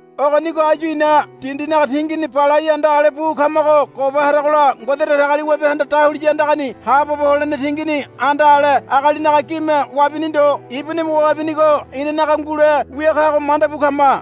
Ogonigo áyu ina dindinaga tingini balai anda ale bu kamago goba haragola Ngode Datagaliwabehanda dahuliya andagani haabobo holene tingini anda ale agalinaga gime wabini ndo ibunime wabinigo inanaga ngule wia kago manda bu kama.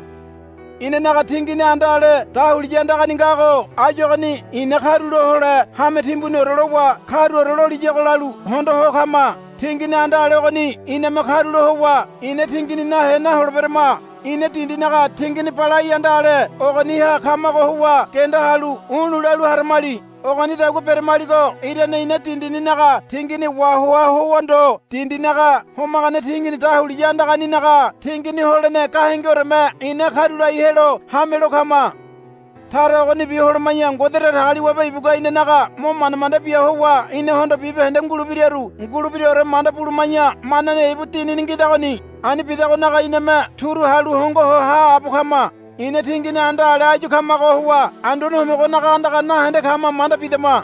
Inanaga tingini anda ale dahuliya andagani ngago áyu ogoni ina karulo hole hame timbuniore lowa karuore loliyago lalu hondo ho kama. Tingini anda ale ogoni iname karulo howa ina tingini nahe naholeberama. Ina dindinaga tingini balai anda ale ogoniha kamago howa genda halu u̱lu̱ lalu haramali. Ogonidagua beramaligo irane ina dindininaga tingini wahoa howa ndo dindinaga homagane tingini dahuliya andaganinaga tingini holene gahengeoreme ina karulai helo hamelo kama. Tara ogonibi holoma̱ya Ngode Datagaliwabe ibugua inanaga mo manda manda bia howa inahondo bibahende ngulebiraru ngulebiraore manda buluma̱ya manane ibu Dinini ngidagoni. Ani bidagonaga iname turu halu hongo ho haabo kama. Ina tingini anda ale áyu kamago howa Anduane Homogonaga andaga nahende kama manda bidama.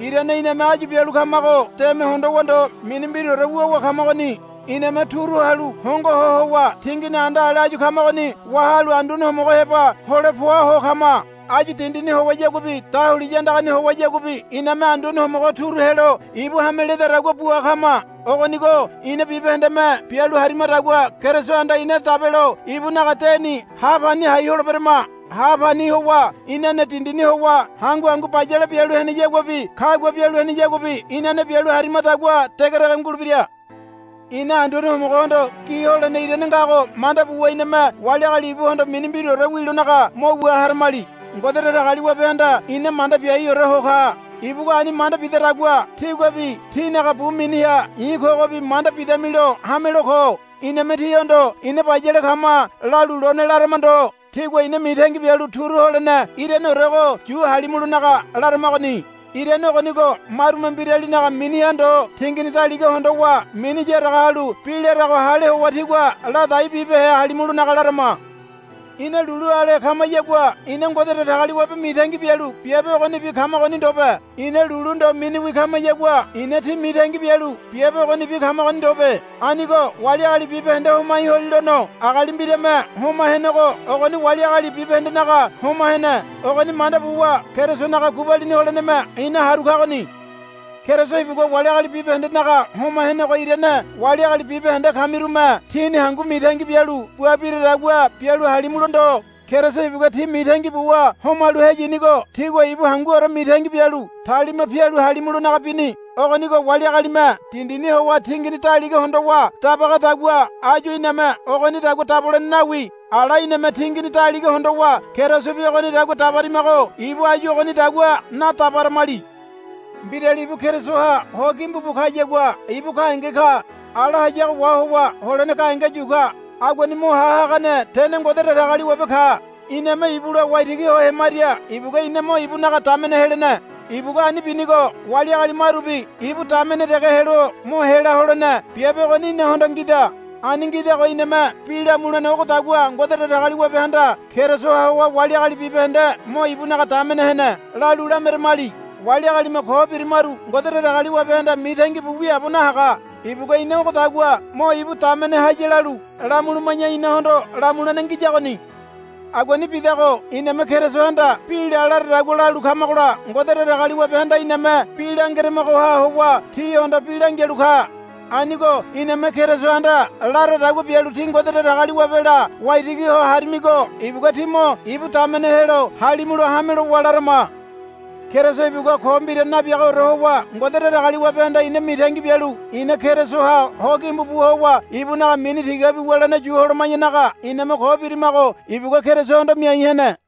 Irane iname áyu bialu kamago deme hondowa ndo mini mbiraore wuwa kamagoni. Iname turu halu hongo ho howa tingini anda ale áyu kamagoni wahalu Anduane Homogo heba hole poa ho kama. Áyu dindini howayaguabi dahuliya andagani howayaguabi iname Anduane Homogo turu helo ibu hame ledadagua bua kama. Ogonigo ina bibahendeme bialu harimadagua Kerisohanda ina dabelo ibunaga deni ha pani hai holeberama. Ha pani howa inane dindini howa hangu hangu bayale bialu heneyaguabi kagua bialu heneyaguabi inane bialu harimadagua degedege ngulebira. Ina Anduane Homogohondo gi holene irane ngago manda buwa iname wali agali ibuhondo mini mbiraore wilonaga mo wua haramali. Ngode Datagaliwabehanda ina manda biaiore ho ka. Ibugua ani manda bidadagua tíguabi tínaga bu miniha i̱ kogobi manda bidamilo hamelo ko. Iname tíhondo, Ina bayale kama, lalu lone larama ndo. Tígua ina mitangi bialu turu holene iraneorego yu halimulonaga laramagoni. Irane ogonigo marume mbiralinaga miniha ndo tingini daliga hondowa mini yaraga halu bi larago hale howa tígua ladai bibehe halimulonaga larama. Ina lulu ale kamayagua ina Ngode Datagaliwabe mitangi bialu biabe ogonibi kamagoni ndobe. Ina lulu ndo miniwi kamayagua ina tí mitangi bialu biabe ogonibi kamagoni ndobe. Anigo wali agali bibahende homai holilono agali mbiralime homa henego ogoni wali agali bibahendenaga homa hene. Ogoni manda buwa Kerisonaga gubalini holeneme ina haru kagoni. Keriso ibugua wali agali bibahendenaga homa henego irane wali agali bibahende kamirume tíni hangu mitangi bialu bua biradagua bialu halimulo ndo. Keriso ibugua tí mitangi buwa homalu heyinigo tígua ibu hanguore mitangi bialu talima pialu halimulonaga bini. Ogonigo wali agalime dindini howa tingini daliga hondowa dabagadagua áyu iname ogonidagua dabolene nawi. Ala iname tingini daliga hondowa Kerisobi ogonidagua dabarimago ibu áyu ogonidagua nadabaramali. Mbirali ibu Kerisoha ho gimbu bu kayagua ibu gahenge ka. Ala hayago wahowa holene gahenge yu ka. Aguani mo ha hagane tene Ngode Datagaliwabe ka. Iname ibula waitigi ho hemaria ibugua ina mo ibunaga damene helene. Ibugua ani binigo wali agali marubi ibu damene dege helo mo hela holene biabe ogoni inahondo ngida. Ani ngidago iname bi lamulene ogodagua, Ngode Datagaliwabehanda Kerisoha howa wali agali bibahende mo ibunaga damene hene, lalu lameramali. Wali agalime ko birimaru Ngode Datagaliwabehanda mitangi bu wiaabo nahaga. Ibugua ina ogodagua mo ibu damene haya lalu lamuluma̱ya inahondo lamulene ngiyagoni. Aguani bidago iname Kerisohanda bi la laradagua lalu kamagola Ngode Datagaliwabehanda iname bi langeramagoha howa tíhondo bi langialu ka. Anigo iname Kerisohanda laradagua bialu tí Ngode Datagaliwabela waitigi ho harimigo ibugua tí mo ibu damene helo halimulo hame lowa larama. Keriso ibugua ko mbira nabiagaore howa Ngode Datagaliwabehanda ina mitangi bialu ina Kerisoha ho gimbu bu howa ibunaga mini tigabi wulene yu holoma̱yanaga iname ko birimago ibugua Kerisohondo miai hene.